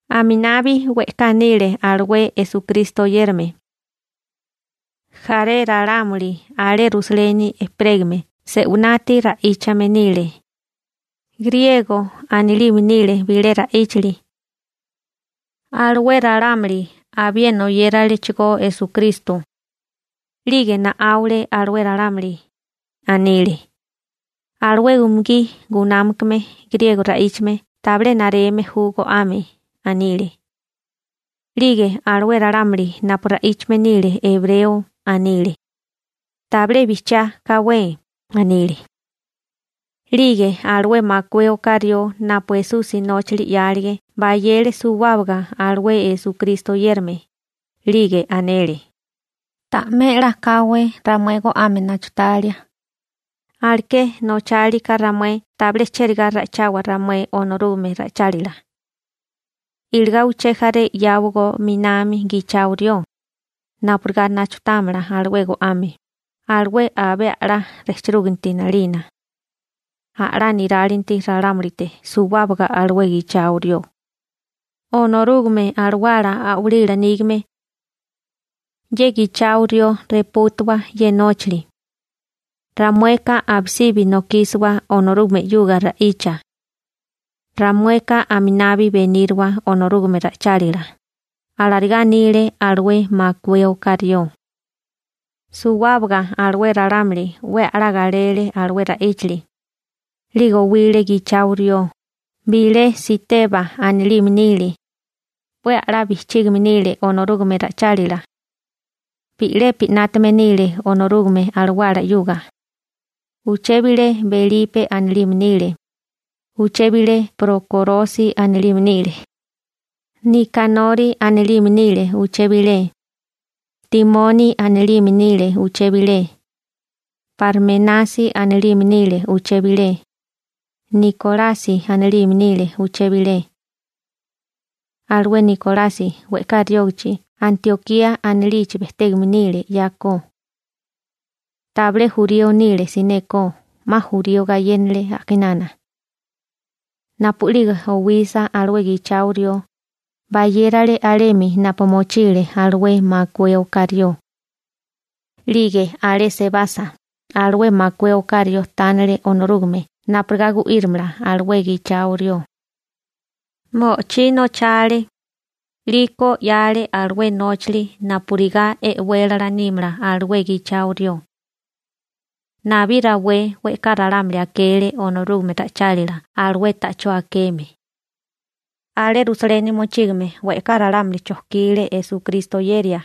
Aminabi we'ká nile alué Esukristo oyérame. Jaré ralámuli alé Rusaleni ejperégame se'winati ra'íchame nile, griego anilime nile bilé ra'íchali. Alué ralámuli abiena oyéralechigó Esukristo. 'Lige na'áule alué ralámuli. Anile: ―Alué umugí gunámakame griego ra'íchame tabilé nareme ju go'ame ―anile. 'Lige alué ralámuli napu ra'íchame nile ebreo anile: ―Tabilé bijchiá káwé ―anile. 'Lige alué makué oká rió napu Esusi nóchali 'yálige bayele suwábaga alué Esukristo oyérame, 'lige anele: ―Ta'mé 'la káwé ramué go'ame nachutalia. Go'ame nachútame níriká ramué tabilé cherigá ikíriwa beniria ramué alué ralámuli Onorúgame nila ra'íchali. Iligá uché jaré 'yáwagó 'minami gichao rió, napurigá nachutámala alué go'ame, alué abé a'lá rejchirúginti 'nalina. A'lá nirálinti ralámulite suwábaga alué gichao rió, Onorúgame Alawala a'walila nígame. Ye gichao rió repútuwa ye nóchali. Ramueka abisibi nokísiwa Onorúgame 'yuga ra'icha. Ramueka aminabi beníriwa Onorúgame ra'ichálila ―alarigá anile alué makué oká rió. Suwábaga alué ralámuli 'we a'lá galele alué ra'íchali. 'Lige owile gichao rió: bilé Siteba anilime nile. 'We a'lá bijchígame nile Onorúgame ra'ichálila. Bi'lepi 'nátame nile Onorúgame Alawala 'yuga. Uché bilé Belipe anilime nile. Uché bilé Prokorosi anilime nile. Nikanori anilime nile uché bilé. Timoni anilime nile uché bilé. Parmenasi anilime nile uché bilé. Nikolasi anilime nile uché bilé. Alué Nikolasi we'ká riógachi Antiokía anilichi bejtégame nile 'yako. Tabilé jurío nile sinékó, 'ma jurío gayénale a'kinana. Napu'lige owisa alué gichao rió, bayérale alemi napu mochile alué makué oká rió. 'Lige alé sebasa, alué makué oká rió tánele Onorúgame napurigá gu'írimala alué gichao rió. Mo'ochí nochale. 'Liko 'yale alué nóchili napurigá e'wélala nímala alué gichao rió. Nabí rawé we'ká ralámuli akele Onorúgame ra'ichálila alué ta'chó akeme. Alé Rusaleni mochígame we'ká ralámuli chojkile Esukristo oyeria.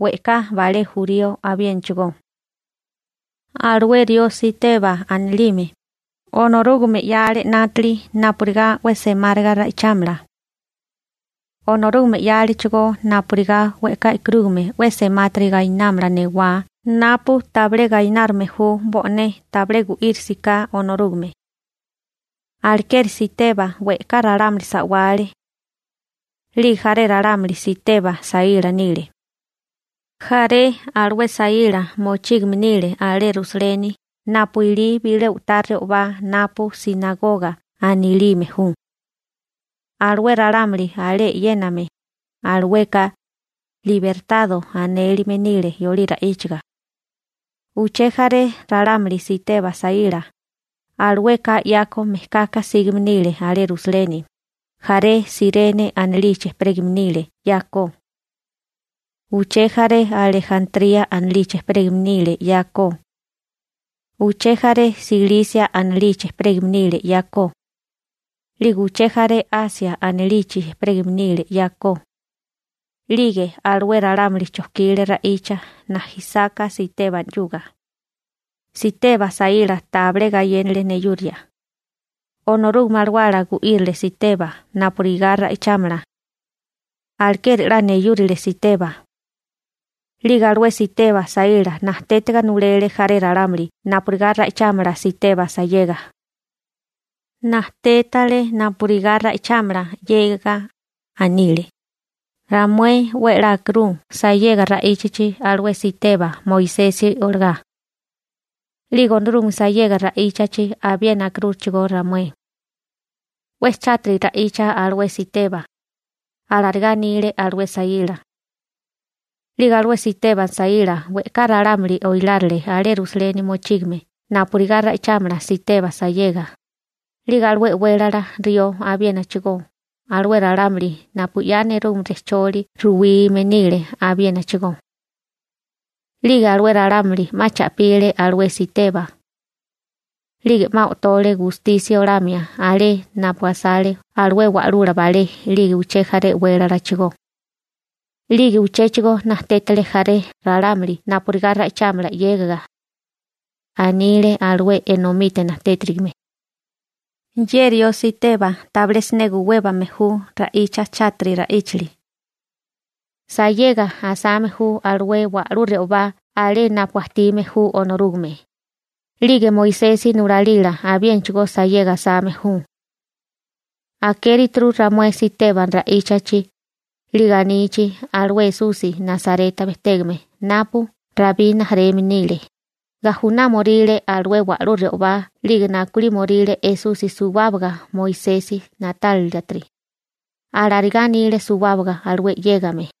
We'ká balé jurío abiénachigo. Alué rió Siteba anilime, Onorúgame 'yale 'nátili napurigá 'we semáriga ra'ichámala. Onorúgame 'yalechigó napurigá we'ká e'karúgame 'we semátiri gainámala newá napu tabilé gainárime ju bo'né tabilé gu'írisiká Onorúgame. Alekeri Siteba we'ká ralámuli sa'wale. 'Lige jaré ralámuli Siteba saíla nile. Jaré alué saíla mochígame nile alé Rusaleni napu ilí bilé u'tá re'obá napu «sinagoga» anilime ju. Alué ralámuli alé e'yéname, alueka «libertado» anélime nile yolí ra'íchaga. Uché jaré ralámuli Siteba saíla, alueka 'yako mejkaka sígame nile alé Rusaleni, jaré Sirene anilichi ejperégame nile 'yako. Uché jaré Alejantría anilichi ejperégame nile 'yako. Uché jaré Silisia anilichi ejperégame nile 'yako. 'Lige uché jaré Asia anilichi ejperégame nile 'yako.'Lige alué ralámuli chojkile ra'icha najisáká Siteba 'yuga. Siteba saíla tabilé gayénale neyuria. Onorúgame Alawala gu'írile Siteba napurigá ra'ichámala. Alekeri 'la neyúrile Siteba. 'Lige alué Siteba saíla najtétiga nulele jaré ralámuli napurigá ra'ichámala Siteba sayega. Najtétale napurigá ra'ichámala 'yégaga. Anile: ―Ramué 'we a'lá akirú sayega ra'íchachi alué Siteba Moisesi olagá. 'Lige Onorúgame sayega ra'íchachi abiena akirúchigó ramué. 'We chátiri ra'icha alué Siteba ―alarigá anile alué saíla. 'Lige alué Siteba saíla we'ká ralámuli oilárile alué Rusaleni mochígame napurigá ra'ichámala Siteba sayega, 'lige alué e'wélala rió abiénachigó, alué ralámuli napu 'ya nerúgame rejcholi ruwime nile abiénachigó. 'Lige alué ralámuli 'ma cha'pile alué Siteba. 'Lige 'ma o'tole gustisia olamia alé napu asale alué wa'lula balé 'lige uché jaré e'wélalachigó. 'Lige uchéchigo najtétale jaré ralámuli napurigá ra'ichámala 'yégaga. Anile alué enomite najtétirigime: ―Ye rió Siteba tabilé siné guwébame ju ra'icha chátiri ra'íchali. Sayega asame ju alué wa'lú re'obá alé napu ajtime ju Onorúgame, 'lige Moisesi nulalila abiénachigó sayega asame ju. Akérituru ramué Siteba ra'íchachi, 'lige anichi alué Esusi Nasareta bejtégame napu Rabí rijimala nile, gajunámoríle alué wa'lú re'obá 'lige nakulímoríle Esusi suwábaga Moisesi na'tálilatiri ―alarigá anile suwábaga alué 'yégame.